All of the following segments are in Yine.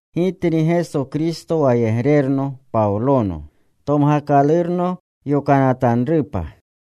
Gitni Geso Kristo wayegrerno Pawlono, tomgakalurno yokanatanrupa,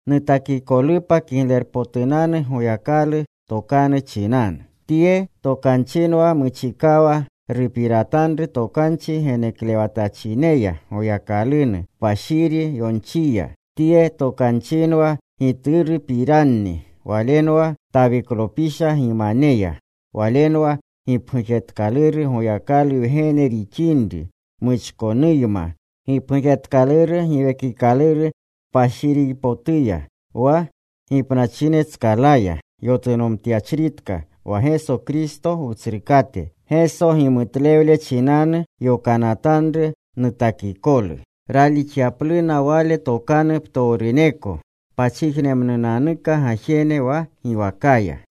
nutakikolupa Kiglerpotunanu Goyakalu Tokanu chinanu. Tye tokanchinwa muchikawa rupiratanru tokanchi geneklewatachineya Goyakalunu, kpashiri yonchiya. Tye tokanchinwa Giturupiranni. Walenwa Tawiklopisha gimaneya. Walenwa gipgujetkaluru Goyakalu Wgene rixinri muchkonuyma. Gipgujetkaluru Giwekikaluru Kpashirpotuya, wa gipnachinetskalaya yotunomtyachritka wa Geso Kristo Wutsrukate. Geso gimutlewle chinanu yokanatanru nutakikolu, ralixyapluna Wale tokanu ptowruneko pachijnemnunanuka gajene wa giwakaya.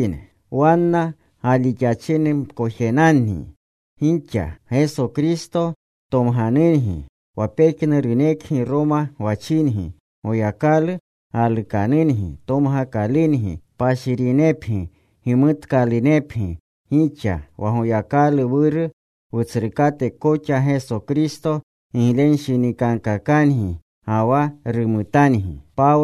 Wanna galixachinemkojenangi gixa. Geso Kristo tomganungi, wa pejnurunekgi Roma gwachingi. Goyakalu galukanungi, tomgakalungi, kpashirinepgi, gimutkalunepgi gixa. Wa Goyakalu Wuru, Wutsrukate koxa Geso Kristo giglenshinikankakangi ga wa rumutangi.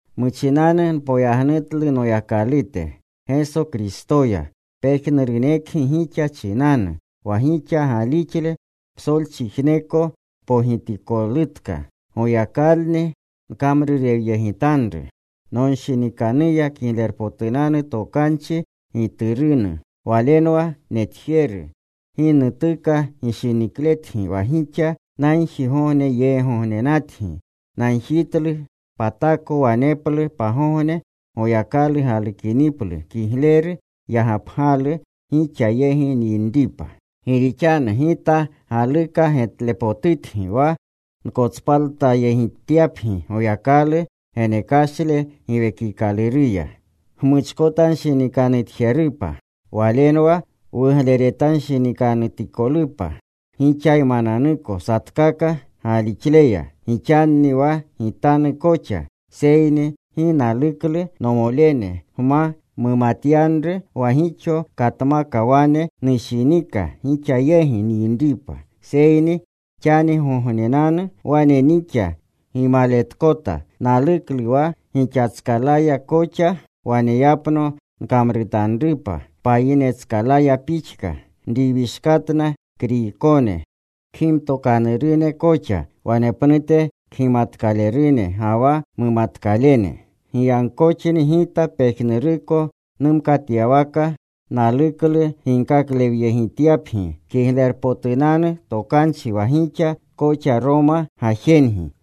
Muchinanu npoyagnutlu Noyakalute, Geso Kristoya pejnurunekgi gixa chinanu, wa gixa galixle psolchijneko pogitikolutka. Goyakalni nkamrurewyegitanru nonshinikanuya Kiglerpotunanu Tokanchi Giturunu. Walenwa netjeru, gi nutuka gishinikletgi wa gixa nagjigogneyeegognenatgi. Nagjitlu patako waneplu pagogne, Goyakalu galukiniplu, kigleru yagapgalu gixa yegi nyinripa. Gi rixanu gita galuka getlepotutgi wa nkotspaltayegityapgi Goyakalu genekashle Giwekikaluruya gmuchkotanshinikanutjerupa. Walenwa wugleretanshinikanutikolupa gixaymananuko satkaka galixleya, gixanni wa gitanu koxa. Seyni gi naluklu, nomolene, gma mumatyanru, wa gixo katmaka wane nushinika gixa yegi nyinripa, seyni xanigognenanu wane nixa gimaletletkota. Naluklu wa gixatskalaya koxa waneyapno nkamrutanrupa, payinetskalaya pixka. Nriwishkatna Kriykone, kgimtokanurune koxa, wanepnute kgimatkalerune ga wa mumatkalene. Giyagkoxni gita pejnuruko numkatyawaka naluklu ginkaklewyegityapgi Kiglerpotunanu Tokanchi wa gixa koxa Roma gajengi.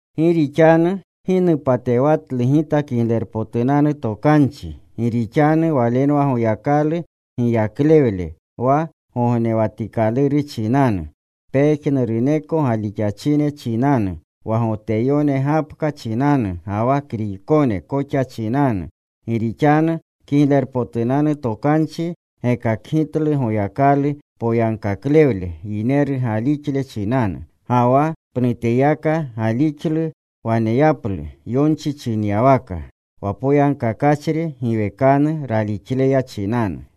Gi rixanu gi nupatewatlu gita Kiglerpotunanu Tokanchi. Gi rixanu walenwa Goyakalu giyaklewle wa gognewatikaluru chinanu, pejnuruneko galixachine chinanu, wa Goteyone gapka chinanu, ga wa Kriykone koxa chinanu. Gi rixanu Kiglerpotunanu Tokanchi gekakgitlu Goyakalu poyagkaklewle yineru galixle chinanu. Ga wa pnuteyaka galixlu waneyaplu, Yonchi chinyawaka: Wa poyagkakachri giwekanu ralixleya chinanu.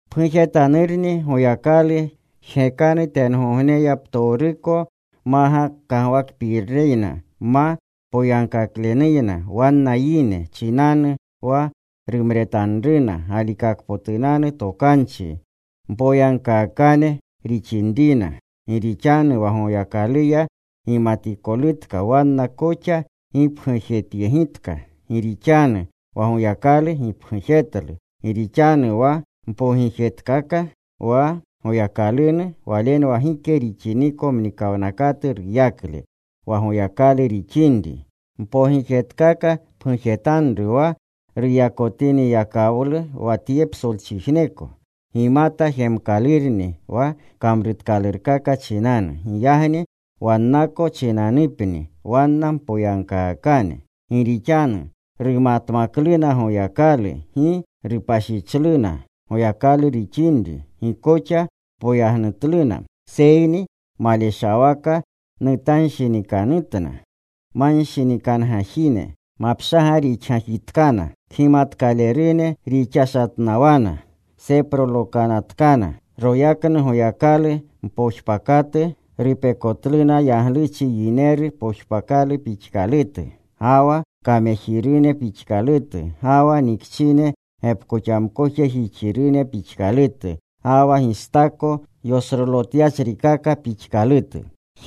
Pgujetanurni Goyakalu jgekanu tengogneya ptowruko makagwakpireyna, ma poyagkaklenuyna wanna yine chinanu wa rumretanruna galikakpotunanu tokanchi mpoyagkaakane rixinrina. Gi rixanu wa Goyakaluya gimatikolutka wanna koxa gipgujetyegitka. Gi rixanu wa Goyakalu gipgujetlu. Gi rixanu wa mpogijetkaka wa Goyakalunu, walenwa gike rixiniko mnikawnakatu ruyakle, wa Goyakalu rixinri. Mpogijetkaka pgujetanru wa ruyakotiniyakawlu wa tye psolchijneko. Gimata jemkalurni wa kamrutkalurkaka chinanu. Giyagni wannako chinanupni, wanna mpoyagkaakane. Gi rixanu rumatmakluna Goyakalu, gi rupashichluna Goyakalu rixinri. Gi koxa poyagnutluna, seyni maleshawaka nutanshinikanutna. Manshinikanugajine mapshaga rixgajitkana. Kgimatkalerune rixashatnawana. Seprolokanatkana. Royaknu Goyakalu mpojpakatu rupekotluna yagluchi yineru pojpakalu pixkalutu, ga wa kamejirune pixkalutu, ga wa nikchine gepkoxamkojejixirune pixkalutu, ga wa gistako yosrolotyachrikaka ixkalutu.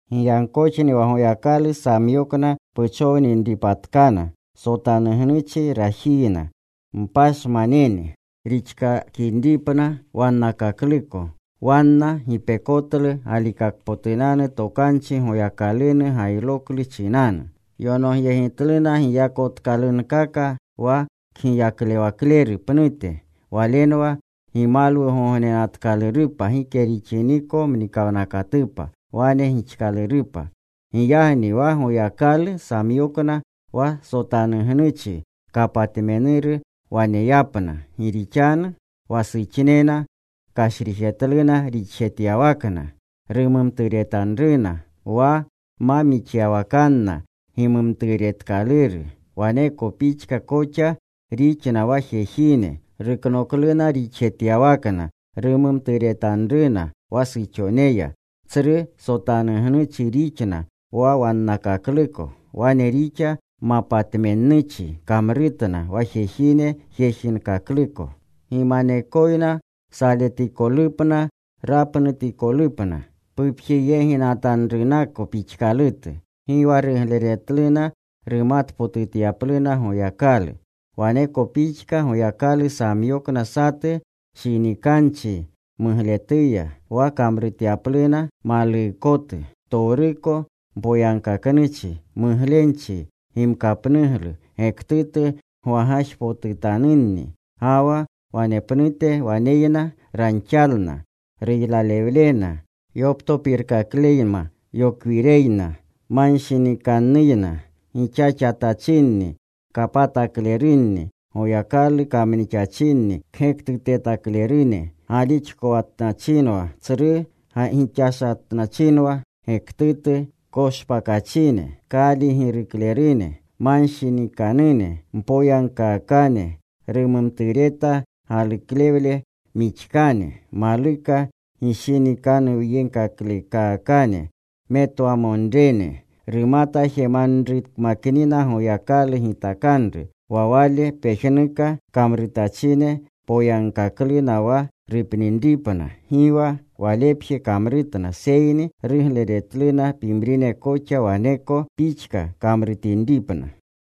Giyagkoxni wa Goyakalu samyokna puchowninripatkana sotanugnuchi rajiyna, mpashmanene rixkakinripna wannakakluko. Wanna gipekotlu galikakpotunanu tokanchi Goyakalunu gayroklu chinanu. Yonogyegitluna, giyakotkalunkaka wa Kgiyaklewakleru pnute. Walenwa gimalwugognenatkalurupa gike rixiniko mnikawnakatupa. Wane gixkalurupa. Giyagni wa Goyakalu samyokna wa sotanugnuchi kapatmenuru waneyapna. Gi rixanu wa suxnena kashrijetluna rixjetyawakna rumumturetanruna wa ma mixyawakanna gimumturetkaluru. Waneko pixka koxa rixna wa jejine. Ruknokluna rixjetyawakna rumumturetanruna wa suxoneya. Tsru sotanugnuchi rixna wa wannakakluko. Wane rixa mapatmennuchi kamrutna wa jejine jejinkakluko. Gimanekoyna saletikolupna rapnutikolupna pupjeyeginatanrunako pixkalutu. Gi wa rugleretluna rumatpotutyapluna Goyakalu. Waneko pixka Goyakalu samyokna satu shinikanchi mugletuya, wa kamrutyapluna maluukotu. Ptowruko mpoyagkaknuchi, muglenchi, gimkapnuglu, gektutu gwagajpotutanunni. Ga wa wanepnute waneyna ranxalna, ruylalewlena, yoptopirkakleyna, yokwireyna, ma nshinikannuyna. Gixaxatachinni. Kapataklerune, Goyakalu kamnixachinni, kgektutetaklerune, galixkotnachinwa, tsru gixashatnachinewa, gektutu koshpakachine, kaaligiruklerune. Manshinikanune, mpoyagkaakane, rumumtureta galuklewle mixkane, maluka gishinikanuwyeglekaakane, metwamonrene. Rumata jemanrukmaknina Goyakalu gitakanru, wa wale pejnuka kamrutachine poyagkakluna wa rupninripna. Gi wa walepje kamrutna, seyni rugleretluna pimrine koxa waneko pixka kamrutinripna.